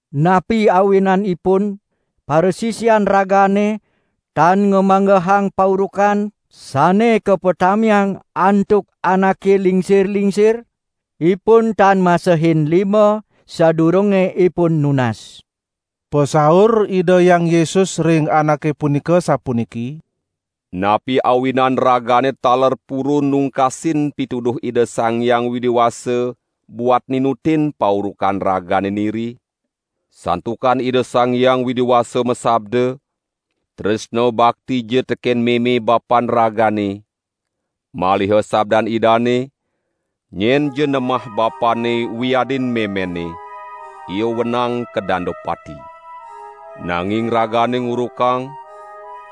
"Napi awinanipun parasisian ragane tan ngamanggehang paurukan sane kapatamiang antuk anake lingsir-lingsir? Ipun tan masehin lima sadurunge ipun nunas." Pasaur Ida Hyang Yesus ring anake punika sapuniki: "Napi awinan ragane taler purun nungkasin pituduh Ida Sang Hyang Widi Wasa buat ninutin paurukan ragane niri? Santukan Ida Sang Hyang Widi Wasa masabda: 'Tresna baktija teken meme bapan ragane,' maliha sabdan Idane: 'Nyenja nemah bapanne wiadin memenne, ia wenang kadanda pati.' Nanging ragane ngurukang: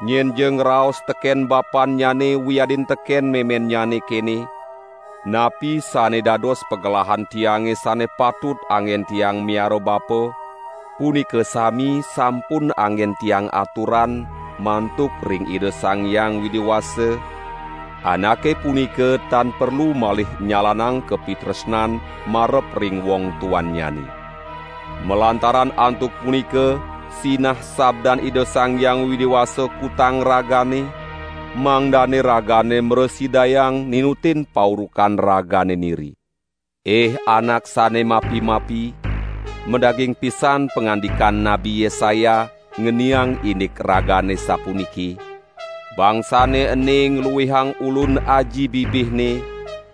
Nyenja ngraos teken bapannyane wiadin teken memennyane kene: 'Napi sane dados pagelahan tiange sane patut anggen tiang miara bapa, punika sami sampun anggen tiang aturan mantuk ring Ida Sang Hyang Widi Wasa,' anake punika tan perlu malih nyalanang kapitresnan marep ring wong tuannyane. Malantaran antuk punika sinah sabdan Ida Sang Hyang Widi Wasa kutang ragane, mangdane ragane mrasidayang ninutin paurukan ragane niri. Ih anak sane mapi-mapi, madaging pisan pangandikan Nabi Yesaya ngeniang indik ragane sapuniki: 'Bangsane ene ngluihang Ulun aji bibihne,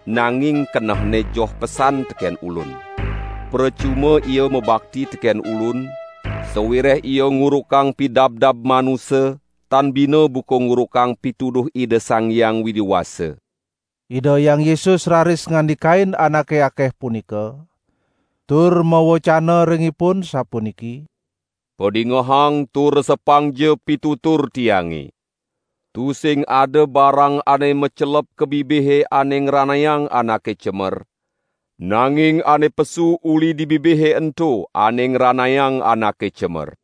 nanging kenehne joh pesan teken Ulun. Precuma ia mabakti teken Ulun, sawireh ia ngurukang pidabdab manusa tan bina buka ngurukang pituduh Ida Sang Hyang Widi Wasa!' " Ida Hyang Yesus raris ngandikain anake akeh punika, tur mawecana ring ipun sapuniki: "Padingehang tur resepangja pitutur Tiange! Tusing ada barang ane macelep ka bibihe ane ngranayang anake cemer, nanging ane pesu uli di bibihe ento ane ngranayang anake cemer."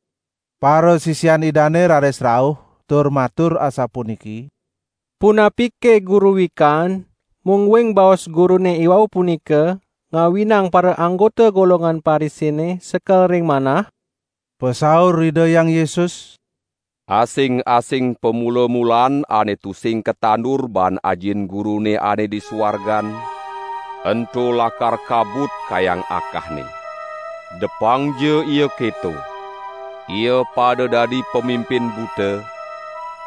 Parasisian Idane raris rauh tur matur asapuniki: "Punapike Guru wikan, mungguing baos Gurune iwau punika ngawinang paraanggota golongan Parisine sekel ring manah?" Pasaur Ida Hyang Yesus: "Asing-asing pamula-mulaan ane tusing katandur baan Ajin Gurune ane di suargan, ento lakar kabut kayang akahne. Depangja ia keto! Ia pada dadi pamimpin buta;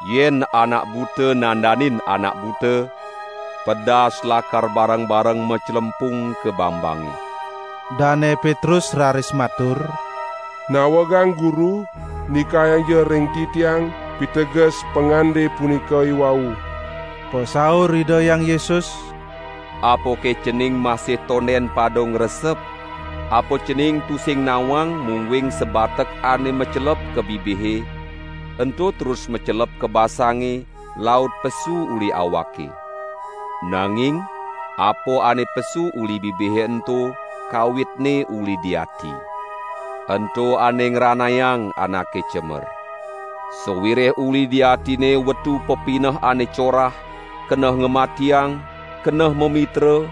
yen anak buta nandanin anak buta, pedas lakar bareng-bareng maclempung ka bangbange." Dane Petrus raris matur: "Nawegang Guru, ndikayangja ring titiang piteges pangande punika iwau." Pasaur Ida Hyang Yesus: "Apake cening masih tonden pada ngresep? Apa cening tusing nawang mungguing sabatek ane macelep ka bibihe, ento terus macelep ka basange, laut pesu uli awake. Nanging apa ane pesu uli bibihe ento kawitne uli di ati. Ento ane ngranayang anake cemer. Sawireh uli di atine wetu pepineh ane corah, keneh ngamatiang, keneh mamitra,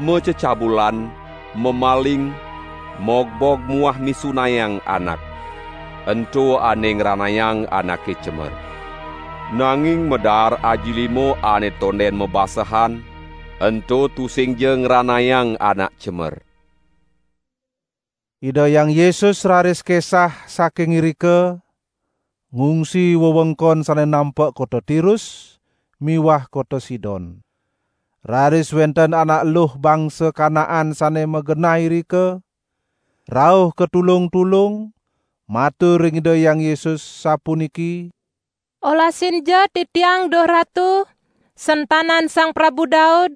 macecabulan, mamaling, mogbog muah misunayang anak. Ento ane ngranayang anake cemer. Nanging madaar aji lima ane tonden mabasehan, ento tusingja ngranayang anak cemer." Ida Hyang Yesus raris kesah saking irika ngungsi wewengkon sane nampek kota Tirus miwah kota Sidon. Raris wenten anak eluh bangsa Kanaan sane magenah irika, rauh katulung-tulung matur ring Ida Hyang Yesus, sapuniki: "Olasinja titiang duh Ratu, sentanan Sang Prabu Daud;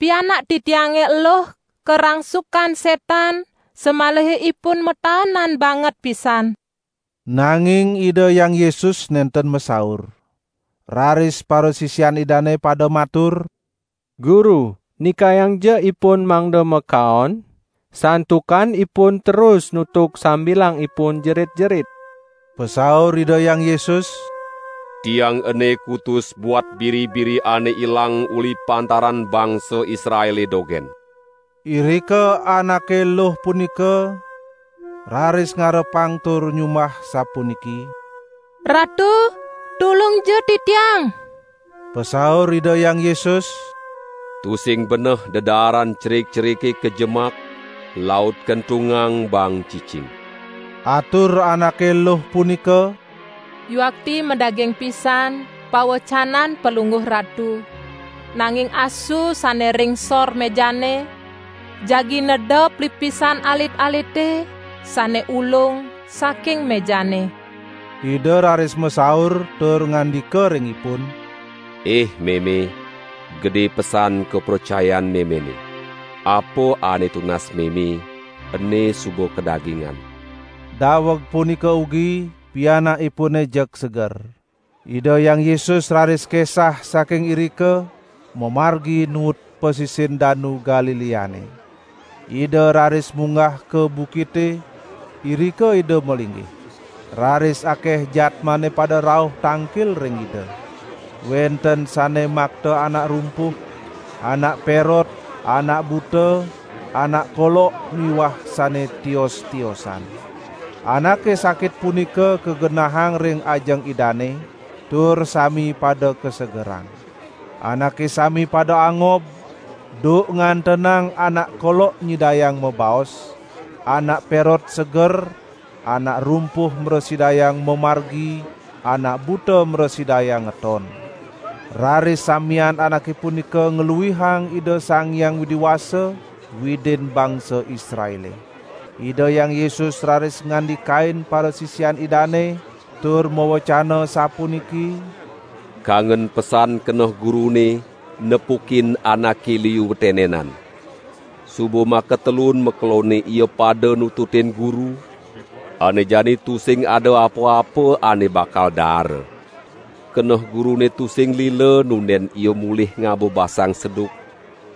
pianak titiange eluh karangsukan setan samaliha ipun mataanan banget pisan." Nanging Ida Hyang Yesus nenten masaur. Raris parasisian Idane pada matur: "Guru nikayangja ipun mangda makaon, santukan ipun terus nutug sambilang ipun jerit-jerit." Pasaur Ida Hyang Yesus: "Tiang ene kutus buat biri-biri ane ilang uli pantaran bangsa Israele dogen." Irika anake eluh punika raris ngarepang tur nyumbah sapuniki: "Ratu, tulungja titiang!" Pasaur Ida Hyang Yesus: "Tusing beneh dedaaran cerik-cerike kajemak laut kentungang baang cicing." Atur anake eluh punika: "Yuakti madaging pisan pawecanan Palungguh Ratu, nanging asu sane ring sor mejane jagi neda plispisan alit-alite sane ulung saking mejane." Ida raris masaur tur ngandika ring ipun: "Ih meme, gede pesan kapracayan memene. Apa ane tunas meme ene suba kadagingan!" Daweg punika ugi pianakipune jeg seger. Ida Hyang Yesus raris kesah saking irika, mamargi nuut pasisin Danu Galileane. Ida raris munggah ka bukite, irika Ida malinggih. Raris akeh jadmane pada rauh tangkil ring Ida. Wenten sane makta anak rumpuh, anak perot, anak buta, anak kolok miwah sane tios-tiosan. Anake sakit punika kagenahang ring ajeng Idane tur sami pada kasegerang. Anake sami pada angob duk ngantenang anak kolok nyidayang mabaos, anak perot seger, anak rumpuh mrasidayang mamargi, anak buta mrasidayang ngeton. Raris samian anake punika ngluihang Ida Sang Hyang Widi Wasa, Widin bangsa Israele. Ida Hyang Yesus raris ngandikain parasisian Idane tur mawecana sapuniki: "Kangen pesan keneh Gurune, nepukin anake liu tenenan. Suba makatelun makelonne ia pada nututin Guru, ane jani tusing ada apa-apa ane bakal daara. Keneh Gurune tusing lila nunden ia mulih ngaba basang seduk,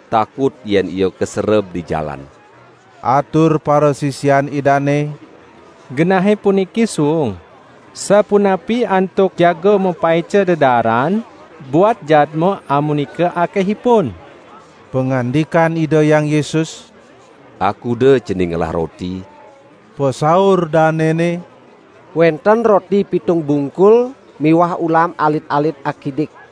takut yen ia kasereb di jalan." Atur parasisian Idane: "Genahe puniki suung, sapunapi antuk jaga mapaica dedaaran buat jadma amunika akehipun?" Pangandikan Ida Hyang Yesus: "Akuda cening ngelah roti?" Pasaur danene: "Wenten roti pitung bungkul miwah ulam alit-alit akidik."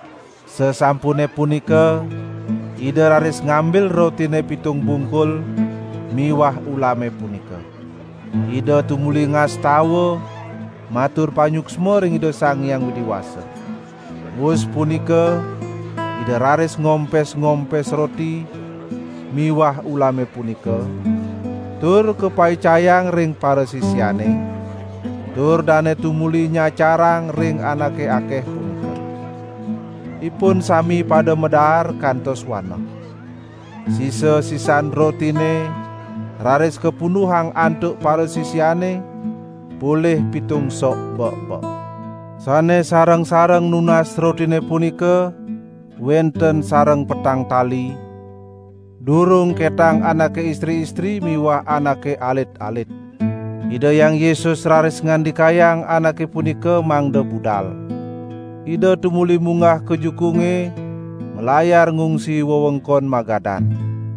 Sasampune punika Ida raris ngambil rotine pitung bungkul miwah ulame punika. Ida tumuli ngastawa matur panyuksma ring Ida Sang Hyang Widi Wasa. Wus punika Ida raris ngompes-ngompes roti miwah ulame punika tur kapaicayang ring parasisiane, tur dane tumuli nyacarang ring anake akeh punika. Ipun sami pada madaar kantos waneh. Sisa-sisan rotine raris kapunduhang antuk parasisiane, polih pitung sok bek-bek. Sane sareng-sareng nunas rotine punika wenten sareng petang tali, durung ketang anake istri-istri miwah anake alit-alit. Ida Hyang Yesus raris ngandikayang anake punika mangda budal. Ida tumuli munggah ka jukunge malayar ngungsi wewengkon Magadan.